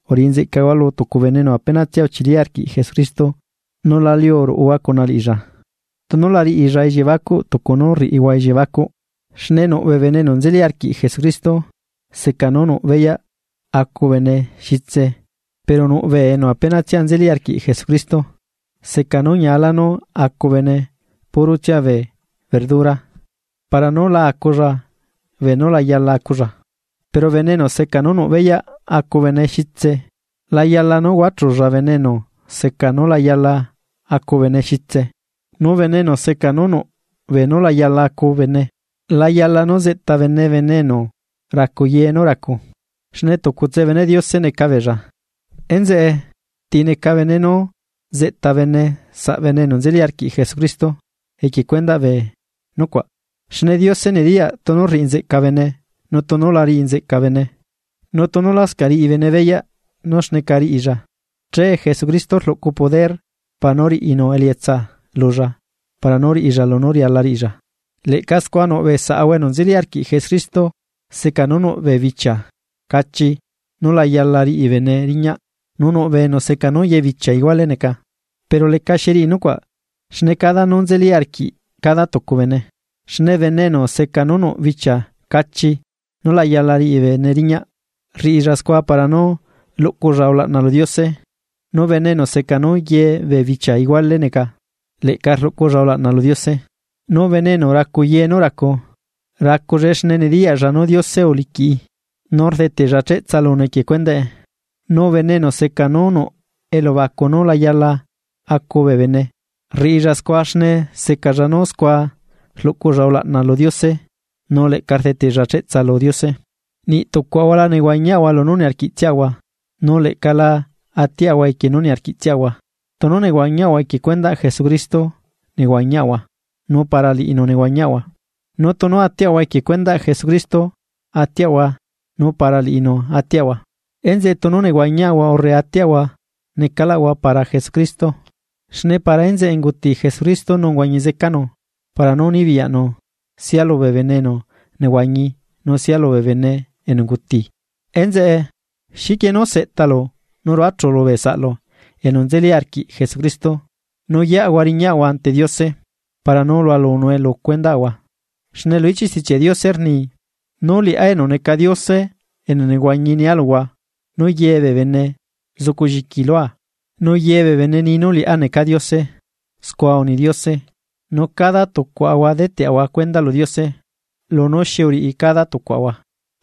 Uriꞌi nzeꞌcahua lu tucu bene enu apenatsia uchili arquiꞌ Jesucristo nu la liu ruꞌuhua cuna liꞌilla, tunu la riꞌilla elliebacuꞌ tucu nú rriꞌihua elliebacuꞌ. Xne nuꞌ bee bene enu nzeli arquiꞌ Jesucristo seca nú nuꞌ beyaꞌ acu bene xitse pero nuꞌbee enu apenatsia nzeli arquiꞌ Jesucristo, seca nú ñialá nú acu bene purotsia bee verdura para nú la aculla beenú la yala aculla. Pero bene enu seca nú nuꞌ beyaꞌ acu bene xitse, la yala nú huachulla bene enu seca nú la yala acu bene xitse. Nu bene enu seca nú nuꞌ beenú la yala acu bene, la yala nú zeꞌta bene bene enu racu ye nú racu, xne tucutse beneꞌ Diose neca beella. Enzeꞌe, ¿ti neca bene nú zeꞌta bene saꞌbene enu nzeli arquiꞌ Jesucristo equie cuendaꞌ bee nucuaꞌ? Xne Diose nediyaꞌ tunu rriꞌi nzeca bene nu tunu la riꞌi nzeꞌca bene. Nu tunu lascaꞌ riꞌi bene beyaꞌ nú xneca riꞌilla, che Jesucristo rluꞌcu poder para nú riꞌinu elietsa lulla para nú riꞌilla lunú riala riꞌilla. Leꞌca scua nuꞌ bee saꞌahua enu nzeli arquiꞌ Jesucristo seca nú nuꞌ bee bichia cachi nú la yala riꞌi bene riñaꞌ nu nuꞌ bee enu seca nú ye bee bichia ihuale neca. Pero lecaxi riꞌi nucuaꞌ xne cada nú nzeli arquiꞌ cada tucu bene. Xne bene enu seca nú nuꞌ bichia cachi nú la yala riꞌi bene riñaꞌ rriꞌilla scua para nú luꞌculla ulaꞌna lu Diose. Nu bene enu seca nú ye bee bichia iguale neca, leꞌca rluꞌculla ulaꞌna lu Diose. Nu bene enu racu ye nú racu, racullae xne nediyaꞌlla nú Diose uliquiꞌi, nu rdeteꞌlla cheꞌtsa lunu equie cuendaꞌe. Nu bene enu seca nú nuꞌ elubacu nú la yala acu bee bene, rriꞌilla scua xne secalla nú scua rluꞌculla ulaꞌna lu Diose nu leꞌca rdeteꞌlla cheꞌtsa lu Diose. Niꞌ tucuaꞌahua la nehuañiaꞌahua lunú niarquiꞌtsiaꞌahua, nu leꞌca la atiaꞌahua equie nú niarquiꞌtsiaꞌahua. Tunu nehuañiaꞌahua, equie cuendaꞌ Jesucristo nehuañiaꞌahua nu para liꞌinu nehuañiaꞌahua, nu tunu atiaꞌahua, equie cuendaꞌ Jesucristo atiaꞌahua nu para liꞌinu atiaꞌahua, enzeꞌe tunu nehuañiaꞌahua urre atiaꞌahua necalaꞌahua para Jesucristo. Xne para enzeꞌe unguti Jesucristo nu uhuañi zecanu, para nú nibiyaꞌnu sia lubee bene enu nehuañi nu sia lubee bene enu unguti. Enzeꞌe, ¿xiquie nú seꞌtalu nu rluachulu bee saꞌlu enu nzeli arquiꞌ Jesucristo? Nu yeꞌahua riñaꞌahua ante Diose para nú lualunue lu cuendaꞌahua. Xne lu ichiꞌ Stichiaꞌ Diose rni: Nu liꞌá enu neca Diose enu nehuañi nia luhua nú ye bee bene zucu lliqui lua. Nu ye bee bene ni nú liꞌá necaa Diose, scua uni Diose. Nu cada tucuaꞌahua deteꞌahua cuenda lu Diose lunú xi uriꞌi cada tucuaꞌahua.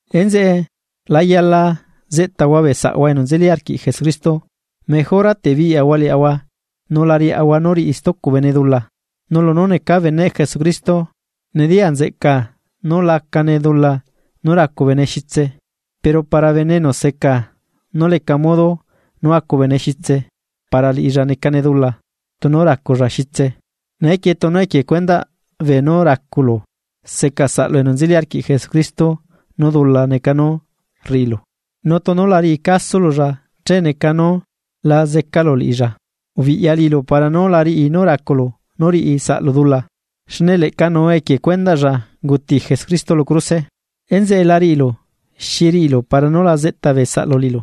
Enzeꞌe, la yala zeꞌtaꞌahua bee saꞌahua enu nzeli arquiꞌ Jesucristo mejora te biꞌyaꞌahua liaꞌahua nú la yala nú riaꞌahua nú riꞌi stucu bene dula. Nu lunú necaa beneꞌ Jesucristo, nediya nzeꞌcaa nú lacane dula nú racu bene xitse pero para bene enu seca nú leca modo nú acu bene xitse, para liꞌilla necane dula tunu raculla xitse. Neequie tunu equie cuendaꞌ beenú raculu seca saꞌlu enu nzeli arquiꞌ Jesucristo nú dula neca nú rriꞌilu, nu tunu la riꞌicasululla che neca nú la zecalu liꞌilla ubiꞌya para nú la riꞌi nú raculu nú riꞌi saꞌlu dula, xne leꞌcanuu equie cuendaꞌlla unguti Jesucristo lu cruse. Enzeꞌe la riꞌilu xi riꞌilu para nú la zeꞌta bee saꞌlu liꞌilu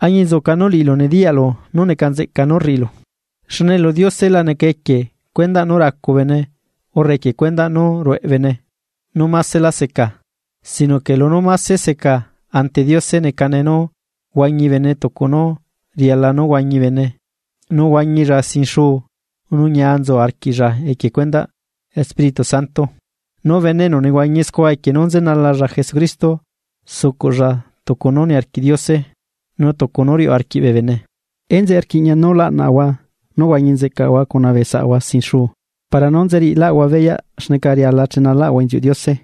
añinzuca nú liꞌilu nediyaꞌlu nú neca nzeꞌca nú rriꞌilu. Xne lu Diose la neca equie cuendaꞌ nú racu bene urre equie cuendaꞌ nú rueꞌe bene nú másela seca, sino que lunú máse seca ante Diose necane nú huañi bene tucu nú riala nú huañi bene nú huañilla sin xuu nu ñia nzu arquiꞌlla equie cuendaꞌ Espíritu Santo. Nu bene enu nehuañi scua equie nú nzenalalla Jesucristo, sucuꞌlla tucu nú niarquiꞌ Diose, nu tucu nú riuꞌ arquiꞌ bee bene. Enzeꞌe rquiꞌña nú laꞌnaꞌahua nú huañi nzeꞌcaꞌahua cuna bee saꞌahua sin xuu para nú nzeriꞌilaꞌahua beyaꞌ xneca riala chenalaꞌahua inziuꞌ Diose.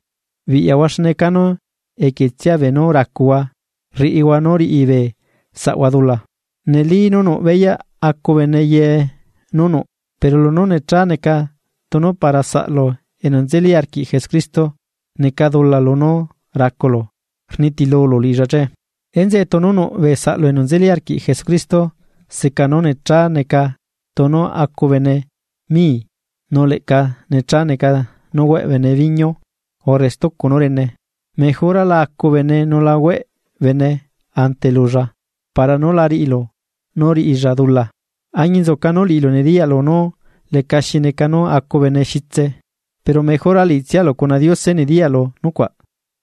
Biꞌyahua xne canú equietsia beenú racuhua riꞌihua nú riꞌi bee saꞌhua dula, neli nú nuꞌ beyaꞌ acu bene ye nú nuꞌ pero lunú necha neca tunu para saꞌlu enu nzeli arquiꞌ Jesucristo neca dula lunú raculu rnitilulu liꞌilla che. Enzeꞌe tunu nuꞌbee saꞌlu enu nzeli arquiꞌ Jesucristo seca nú necha neca tunu acu bene mii nu leꞌca necha neca nú hueꞌ bene viñiu urre stucu nú rene, mejora la acu bene nu la hueꞌ bene ante lulla para nú la riꞌilu nú riꞌilla dula. Añinzuca nú liꞌilu nediyaꞌlu nú lecaxi neca nú acu bene xitse, pero mejora liꞌitsialu cuna Diose nediyaꞌlu nucuaꞌ.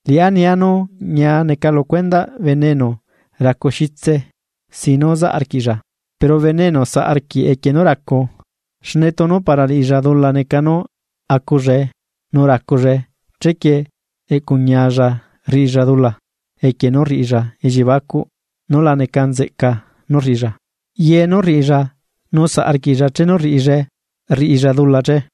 Liꞌá nia nú ñia neca lu cuendaꞌ bene enu racu xitse sin nú zaꞌ arquiꞌlla. Pero bene enu saꞌ arquiꞌ equie nú racu, xne tunu para liꞌilla dula neca nú acullae nu racullae chequie eꞌcuñialla rriꞌilla dula equie nú rriꞌilla elliebacuꞌ nú la neca nzeꞌca nú rriꞌilla. Ye nú rriꞌilla nu saꞌ arquiꞌlla chenu rriꞌillae rriꞌilla dula che.